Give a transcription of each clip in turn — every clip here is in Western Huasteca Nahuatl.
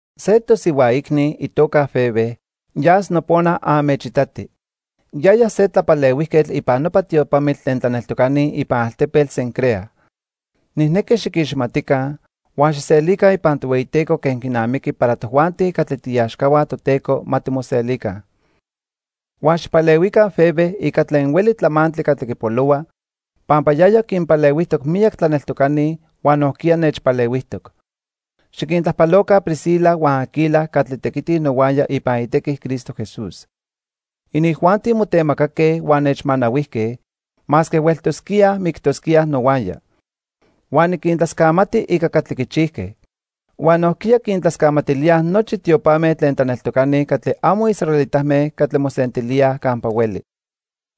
Se tosihua icni, itoca Febe, yas nopona anmechitati. Yaya se tlapalehuijquetl ipan nopa tiopamitl tlen tlaneltocani ipan altepetl Cencrea. Nijnequi xiquiximatica, huan xijselica ipan Tohueyiteco quen quinamiqui para tojuanti catli tiiaxcahua Toteco ma timoselica. Huan xijpalehuica Febe ica tlen hueli tlamantli catli quipolohua, pampa yaya quinpalehuijtoc miyac tlaneltocani huan nojquiya nechpalehuijtoc. Xiquintlajpaloca Priscila huan Aquila catli tequitij nohuaya ipan itequi Cristo Jesús. Inijuanti motemacaque huan nechmanahuijque, masque hueltosquíaj mictosquíaj nohuaya. Huan niquintlascamati ica catli quichijque. Huan nojquiya quintlascamatilíaj nochi tiopame tlen tlaneltocani catli amo israelitame catli mosentilíaj campa hueli.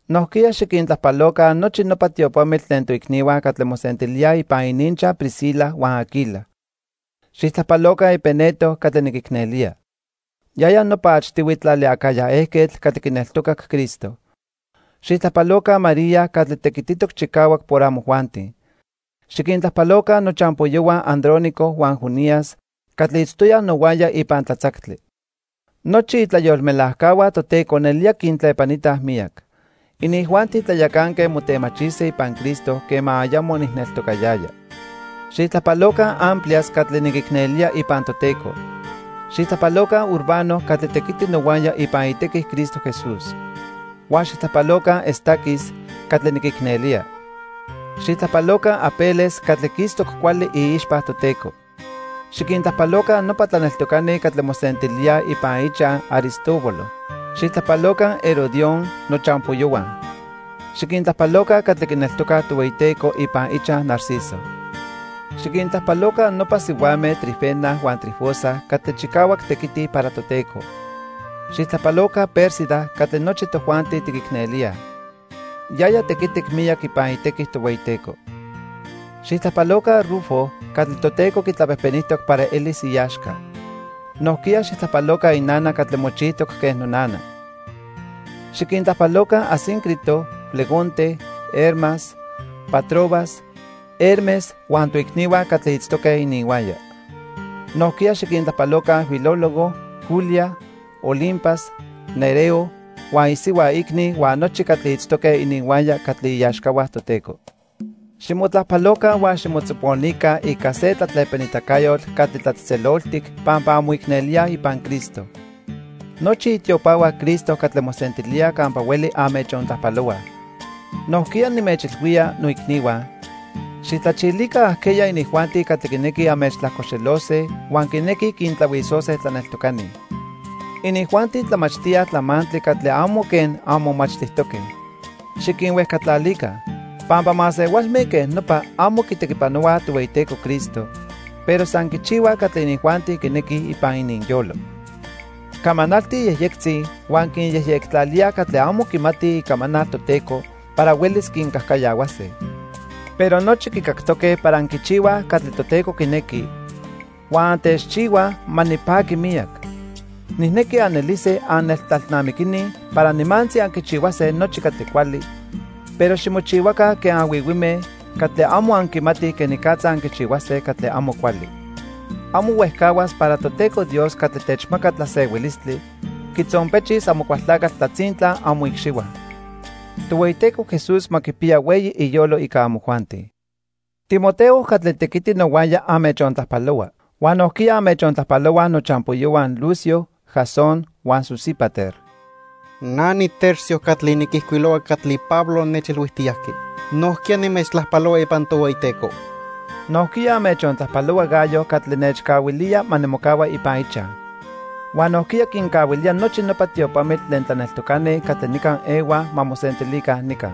Nojquiya xiquintlajpaloca nochi nopa tiopamitl tlen toicnihua catli mosentilíaj ipan ininchaj Priscila huan Aquila. Xijtlajpaloca Epeneto catli niquicnelía. Yaya nopa achtihui tlali Acaya ejquetl catli quineltocac Cristo. Xijtlajpaloca María catli tequititoc chicahuac por amojuanti. Xiquintlajpaloca nochampoyohua Andrónico huan Junias catli itztoyaj nohuaya ipan tlatzactli. Nochi itlayolmelajcahua Toteco nelía quintlepanitaj miyac. Inijuanti tlayacanque motemachise ipan Cristo quema ayamo nijneltocayaya. Xijtlajpaloca Amplias catli niquicnelía ipan Toteco. Xijtlajpaloca Urbano catli tequiti nohuaya ipan itequi Cristo Jesús. Huan xijtlajpaloca Estaquis catli niquicnelía. Xijtlajpaloca Apeles catli quistoc cuali iixpa Toteco. Xiquintlajpaloca nopa tlaneltocani catli mosentilíaj ipan ichaj Aristóbulo. Xijtlajpaloca Herodión, nochampoyohua. Xiquintlajpaloca catli quineltocaj Tohueyiteco ipan ichaj Narciso. Xiquintlajpaloca nopa sihuame Trifena huan Trifosa catli chicahuac tequitij para Toteco. Xijtlajpaloca Pérsida catli nochi tojuanti tiquicnelíaj. Yaya tequitic miyac ipan itequi Tohueyiteco. Xijtlajpaloca Rufo catli Toteco quitlapejpenijtoc para elis iaxca. Nojquiya xijtlajpaloca inana catli mochijtoc quen nonana. Xiquintlajpaloca Asíncrito, Flegonte, Hermas, Patrobas, Hermes huan toicnihua catli itztoque ininhuaya. Nojquiya xiquintlajpaloca Filólogo, Julia, Olimpas, Nereo huan isihua icni huan nochi catli itztoque ininhuaya catli iaxcahua Toteco. Ximotlajpaloca huan ximotzoponica ica se tlatlepanitacayotl catli tlatzejtzeloltic pampa anmoicnelíaj ipan Cristo. Nochi itiopahua Cristo catli mosentilíaj campa hueli anmechontlajpalohuaj. Nojquiya, nimechilhuía, noicnihua, xijtlachilica ajqueya inijuanti catli quinequij anmechtlajcoxelose huan quinequij quintlahuisose tlaneltocani. Inijuanti tlamachtíaj tlamantli catli amo quen anmomachtijtoque. Xiquinhuejcatlalica. Pampa masehualme quen nopa amo quitequipanohuaj Tohueyiteco Cristo, pero san quichihuaj catli inijuanti quinequij ipan ininyolo. Camanaltij yejyectzi huan quinyejyectlalíaj catli amo quimatij icamanal Toteco para huelis quincajcayahuase. Pero nochi quicactoque para anquichihuaj catli Toteco quinequi, huan antechchihuaj ma nipaqui miyac. Nijnequi anelise anneltlalnamiquini para nimantzi anquichihuase nochi catli cuali, pero ximochihuaca quen anhuihuime catli amo anquimatij quenicatza anquichihuase catli amo cuali. Amo huejcahuas para Toteco Dios catli techmaca tlasehuilistli quitzonpechis Amocualtlacatl tlatzintla amoicxihua. Tohueyiteco Jesús ma quipiya hueyi iyolo ica amojuanti. Timoteo catli tequiti nohuaya anmechontlajpalohua. Huan nojquiya anmechontlajpalohuaj nochampoyohua Lucio, Jasón huan Sosípater. Na niTercio catli niquijcuilohua catli Pablo nechilhuijtiyajqui, nojquiya nimechtlajpalohua ipan Tohueyiteco. Nojquiya anmechontlajpalohua Gayo catli nechcahuilía ma nimocahua ipan ichaj. Huan nojquiya quincahuilía nochi nopa tiopamitl tlen tlaneltocani catli nica ehuaj ma mosentilica nica.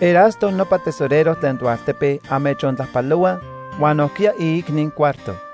Erasto nopa tesorero tlen toaltepe anmechontlajpalohua huan nojquiya iicni Cuarto.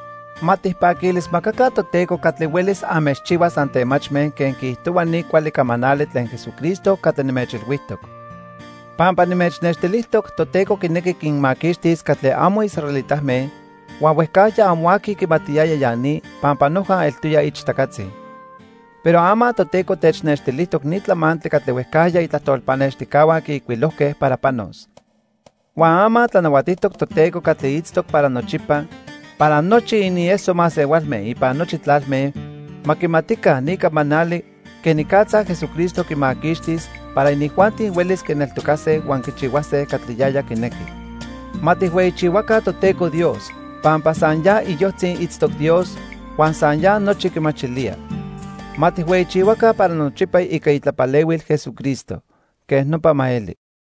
Ma tijpaquilismacaca Toteco catli huelis anmechchihuas antemachme quen quiijtohua ni cuali camanali tlen Jesucristo catli nimechilhuijtoc. Pampa nimechnextilijtoc Toteco quinequi quinmaquixtis catli amo israelitame huan huejcajya amo aqui quimatiyaya ya ni pampa noja eltoya ichtacatzi. Pero ama Toteco technextilijtoc ni tlamantli catli huejcajya itlajtol pannextijcahua quiijcuilojque para panos. Huan ama tlanahuatijtoc Toteco catli itztoc para nochipa para nochi inieso masehualme ipan nochi tlalme ma quimatica ni camanali quenicatza Jesucristo quimaquixtis para inijuanti huelis quineltocase huan quichihuase catli yaya quinequi. ¡Ma tijhueyichihuaca Toteco Dios pampa san ya iyojtzi itztoc Dios huan san ya nochi quimachilía! Ma tijhueyichihuaca para nochipa ica itlapalehuil Jesucristo. Quej nopa ma eli.